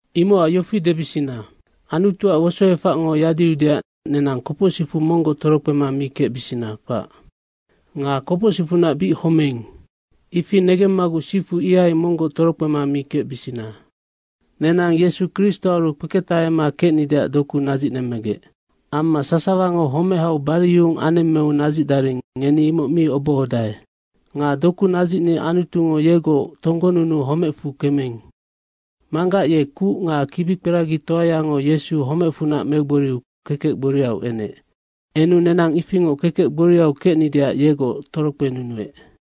Imocac yofi debisina. Anutuac wosoefacngo yadiudeac nenang kopocsicfu monggoc torokpema mi kecbisina, kpac. Nga kopocsicfunac bic homeing, ifi negemmaguc sifu ihai monggoc torokpema mi kecbisina. Nenang Yesu Kristoaru kpeketahama kecnideac doku nadzicnemmegec. Amma sasawango homehau bariyuhung anemmeu nadzicdaring, ngeni imoc mi obohodae. Nga doku nadzicni Anutungo yegoc tonggonunuu homecfu kemeing. Manggac ye kuc nga kibikperagitoayango Yesu homecfunac megboriu kekec gboriau enec. Enu nenang ifingoc kekec gboriau kecnideac yegoc torokpenunuec.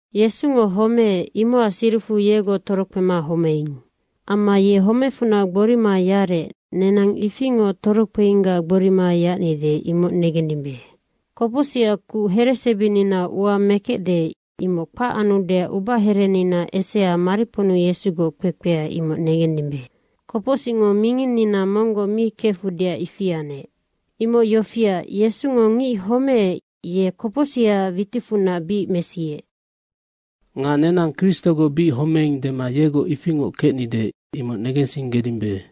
Yesungo homeec, imocac siricfu yegoc torokpema homeing. Amma ye homecfunac gborima yarec, nenang ifingoc torokpeinggac gborima yacnide imoc negendimbe. Kopocsicac kuc heresebininau ua mekecde, imoc kpac anudeac ubaherenina esea mariponnu Yesugoc kpekpea, imoc negendimbe. Kopocsicngo minginnina monggoc mi kefudeac ifi anec. Imoc yofiac, Yesungo ngic homeec, ye kopocsihaac witicfunac bic mesiec. Nga nenang Kristogoc bic homeing dema yegoc ifingoc kecnide, imoc negensinggedimbe.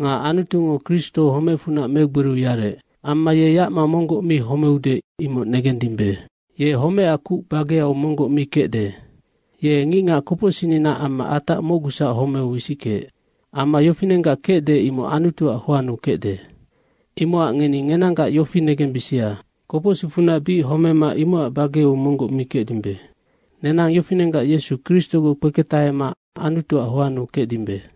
Nga Anutungo Kristo homecfunac megboriu yarec. Amma ye yacma monggoc mi homeude, imocnoc negendimbe. Ye homecac kuc bageau monggoc mi kecde. Ye ngicngac kopocsicninaac amma atac mocgusac homeu wisickeec. Amma yofinenggac kecde, imoc Anutuac hoannu kecde. Imocac ngeni ngenanggac yofi negembisia, kopocsicfunac bic homema imocac bageau monggoc mi kecdimbe. Nenang yofinenggac Yesu Kristogoc kpeketahema Anutuac hoannu kecdimbe.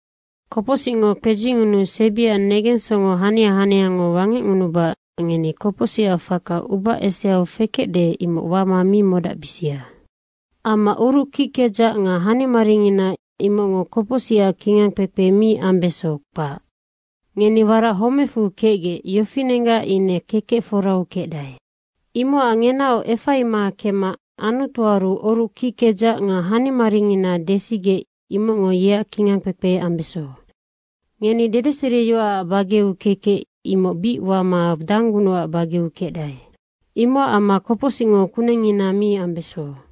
Kopocsicngo kpedzingunuu sebiac negensongo hania haniango wangecngunubacac ngeni kopocsic faka uba eseau fekecde, imoc wama mi modacbisia. Amma oruc kickedzac nga hanimaringina imocngo kopocsicac kingangkpekpe mi ambeso, kpac. Ngeni warac homecfu kecgec, yofinenggac ine kekec forau kecdae, imocac ngenaoc efaima kemma Anutuaru oruc kickedzac nga hanimaringina desigec imocngo yeac kingangkpekpe ambeso. Ngeni dedeseriyoacac bageau kekec, imoc bic wama danggunucac bageau kecdae, imocac amma kopocsingo kunengngina mi ambeso.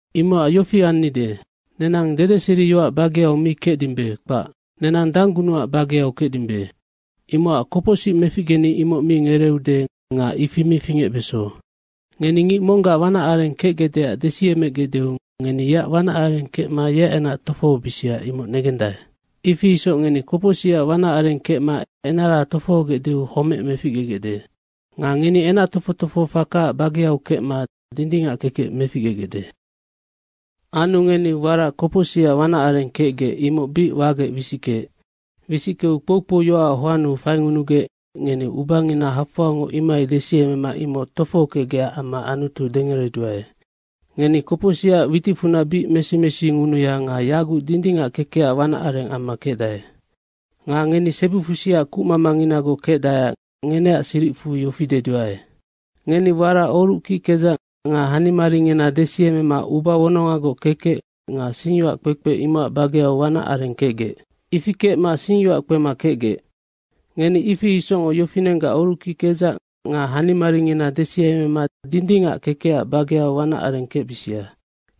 Imocac yofi annide. Nenang dedeseriyoac bageau mi kecdimbe, kpac. Nenang danggunucac bageau kecdimbe. Imocac kopocsic meficgeni, imoc mi ngereeude nga ifi mi fingecbeso! Ngeni ngic monggac wanac areng kecgecdeac desiemegecdeu ngeni yeac wanac areng kecma yeac enac tofohobisia, imoc negendae. Ifi isoc ngeni kopocsicac wanac areng kecma enara tofohogecdeu homec meficgegecde. Nga ngeni enac tofoc tofohofakaac bageau kecma dindingac kekec meficgegecde. Anu ngeni warac kopocsicac wanac areng kecgec, imoc bic wagec wisickeec. Wisickeu kpoukpouyoacac hoannu faingunugec, ngeni ubangina hafoangoc imohai desiemema imoc tofohokecgecac amma Anutu dengereduae. Ngeni kopocsicac witicfunac bic mesi mesingunuya nga yaguc dindingac kekecac wanac areng amma kecdae. Nga ngeni sebifusiac kucmamanginagoc kecdaeac ngeneac siricfu yofi deduae. Ngeni warac oruc kickedzac nga hanimaringina desiemema uba wonongagoc kekec nga singyoac kpekpe, imocac bageau wanac areng kecgec. Ifi kecma singyoac kpema kecgec. Ngeni ifi isocngoc yofinenggac oruc kickedzac nga hanimaringina desiemema dindingac kekecac bageau wanac areng kecbisia.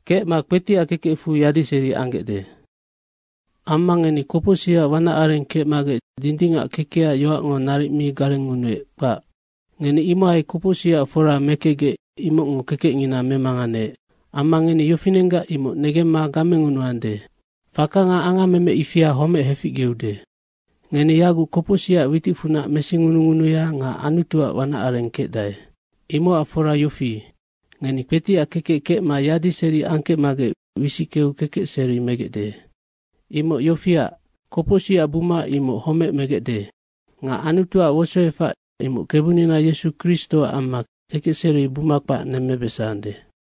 Kecma kpetiac kekecfu yadiseri anggecde. Amma ngeni kopocsicac wanac areng kecmagec dindingac kekecac yoacngo naric mi garengngunuec, kpac. Ngeni imohai kopocsicac fora mekecgec imocngo kekecngina memanganeec amma ngeni yofinenggac imoc negemma gamengunuande. Faka nga angammeme ifianoc homec heficgeude. Ngeni yaguc kopocsicac witicfunac mesingunungunuya nga Anutuac wanac areng kecdae, imocac fora yofi, ngeni kpetiac kekec kecma yadiseri angkecmagec wisickeu kekecseri megecde. Imoc yofiac, kopocsicac buma imoc homec megecde nga Anutuac wosoefac, imoc Kebunina Yesu Kristoac amma kekecseri buma kpac nemmebesande.